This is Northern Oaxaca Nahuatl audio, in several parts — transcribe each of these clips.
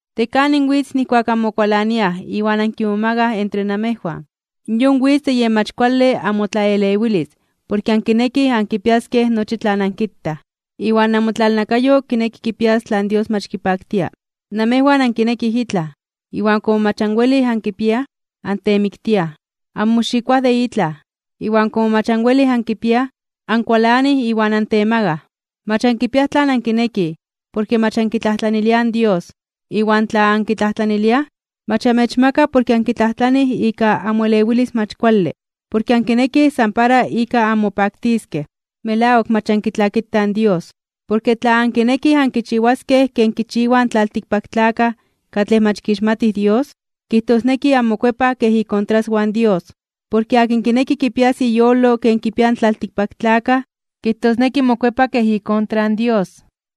¿De kanin witz nijkuak anmokualaniaj iwan ankimomagaj (onkimomakaj) entre namejwan? Yon witz de yen mach kuale amotlaelewilis porke ankinekij ankipiaskej nochi tlan ankitaj, iwan namotlalnakayo kineki kipias tlan Dios mach kipaktia. Namejwan ankinekij itlaj, iwan komo mach anwelij ankipiaj, antemiktiaj. Anmoxikoaj de itlaj, iwan komo mach anwelij ankipiaj, ankualanij iwan antemagaj (ontemakaj). Mach ankipiaj tlan ankinekij, porke mach ankitlajtlaniliaj in Dios. Iwan tla ankitlajtlaniliaj, mach amechmaka porke ankitlajtlanij ika amoelewilis mach kuale. Porke ankinekij san para ika anmopaktiskej. ¡Melawak mach ankitlakitaj in Dios! Porke tla ankinekij ankichiwaskej ken kichiwaj in tlaltikpaktlakaj katlej mach kixmatij Dios, kijtosneki anmokuepaj kej ikontraswan Dios. Porke akin kineki kipias iyolo ken kipiaj in tlaltikpaktlakaj, kijtosneki mokuepa kej ikontra in Dios.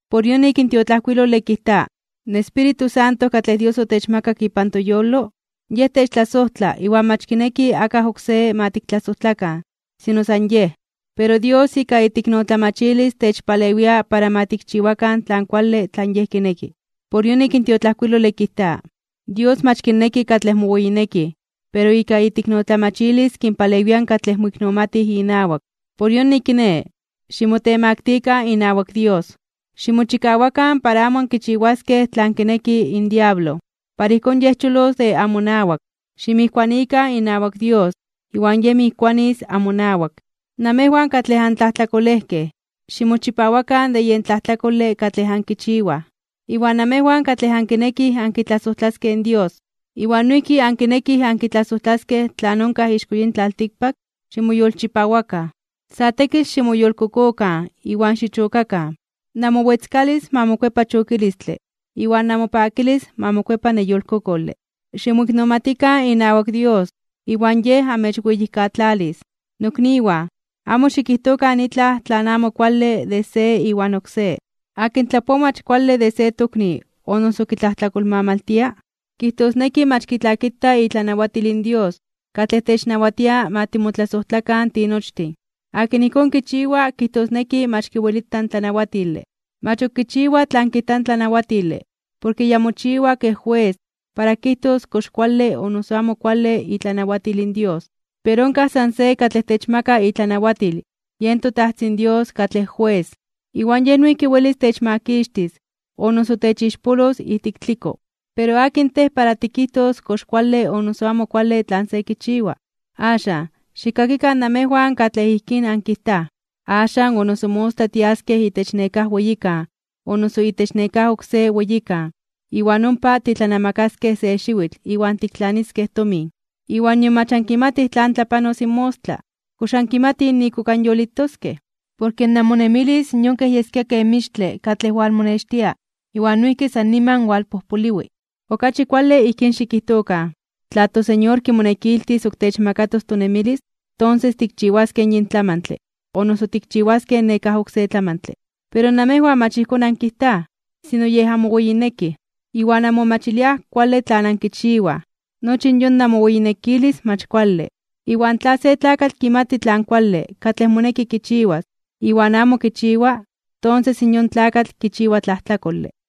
Por yonik in tiotlajkuilole kijta: “In Espíritu Santo katlej Dios otechmakak ipan toyolo, Yej techtlasojtla iwan mach kineki akaj oksé ma tiktlasojtlakan, sino san Yej.” Pero Dios ika iteiknotlamachilis techpalewia para ma tikchiwakan tlan kuale tlan Yej kineki. Por yonik in tiotlajkuilole kijta: “Dios mach kinneki katlej moweyinekij, pero ika iteiknotlamachilis kinpalewia katlej moiknomatij inawak.” Por yonik kiné, ximotemaktikan (ximotemaktilikan) inawak Dios. Ximochikawakan para amo ankichiwaskej tlan kineki in diablo, iwan ijkón yej cholos de amonawak. Ximijkuanikan inawak Dios, iwan Yej mijkuanis amonawak. Namejwan katlej antlajtlakolejkej, ximochipawakan de yen tlajtlakole katlej ankichiwaj. Iwan namejwan katlej ankinekij ankitlasojtlaskej Dios iwan noijki ankinekij ankitlasojtlaskej tlan onkaj ixko yin tlaltikpak, ximoyolchipawakan. Sa tekitl ximoyolkokokan iwan xichokakan. Namowetzkalis ma mokuepa chokilistle, iwan namopakilis ma mokuepa neyolkokole. Ximoiknomatikan inawak Dios, iwan Yej amechweyijkatlalis. Nokniwan, amo xikijtokan itlaj tlan amo kuale de se iwan oksé. Akin tlapoa mach kuale de se tokni o noso kitlajtlakolmamaltia, kijtosneki mach kitlakita itlanawatil in Dios katlej technawatia ma timotlasojtlakan tinochtin. Akin ijkón kichiwa kijtosneki mach kiwelita in tlanawatile. Mach ok kichiwa tlan kijta in tlanawatile porke ya mochiwa kej jues para kijtos kox kuale o noso amo kuale itlanawatil in Dios. Pero onkaj san se katlej techmaka itlanawatil, yen toTajtzin Dios katlej Jues. Iwan Yej noijki welis techmakixtis o noso techixpolos ijtik tliko. Pero, ¿akin tej para tikijtos kox kuale o noso amo kuale tlan se kichiwa? Axan, xikkakikan, namejwan katlej ijkín ankijtaj: “Axan o noso mostla tiaskej itech nekáj weyikan o noso itech nekáj oksé weyikan, iwan ompa titlanamakaskej se xiwitl iwan tiktlaniskej tomin.” Iwan nion mach ankimatij tlan tlapanos in mostla. ¿Kox ankimatij nik ok anyolitoskej? Porke namonemilis yon kej yeskia ken mixtle katlej walmonextia iwan noijki san niman walpojpoliwi. Okachi kuale ijkín xikijtokan: “Tla in toSeñor kimonekiltis ok techmakatos tonemilis, tonses tikchiwaskej yin tlamantle o noso tikchiwaskej nekáj oksé tlamantle.” Pero namejwan mach ijkón ankijtaj, sino yej anmoweyinekij, iwan anmomachiliaj kuale tlan ankichiwaj. Nochi yon namoweyinekilis mach kuale. Iwan tla se tlakatl kimati tlan kuale katlej moneki kichiwas iwan amo kichiwa, tonses in yon tlakatl kichiwa tlajtlakole.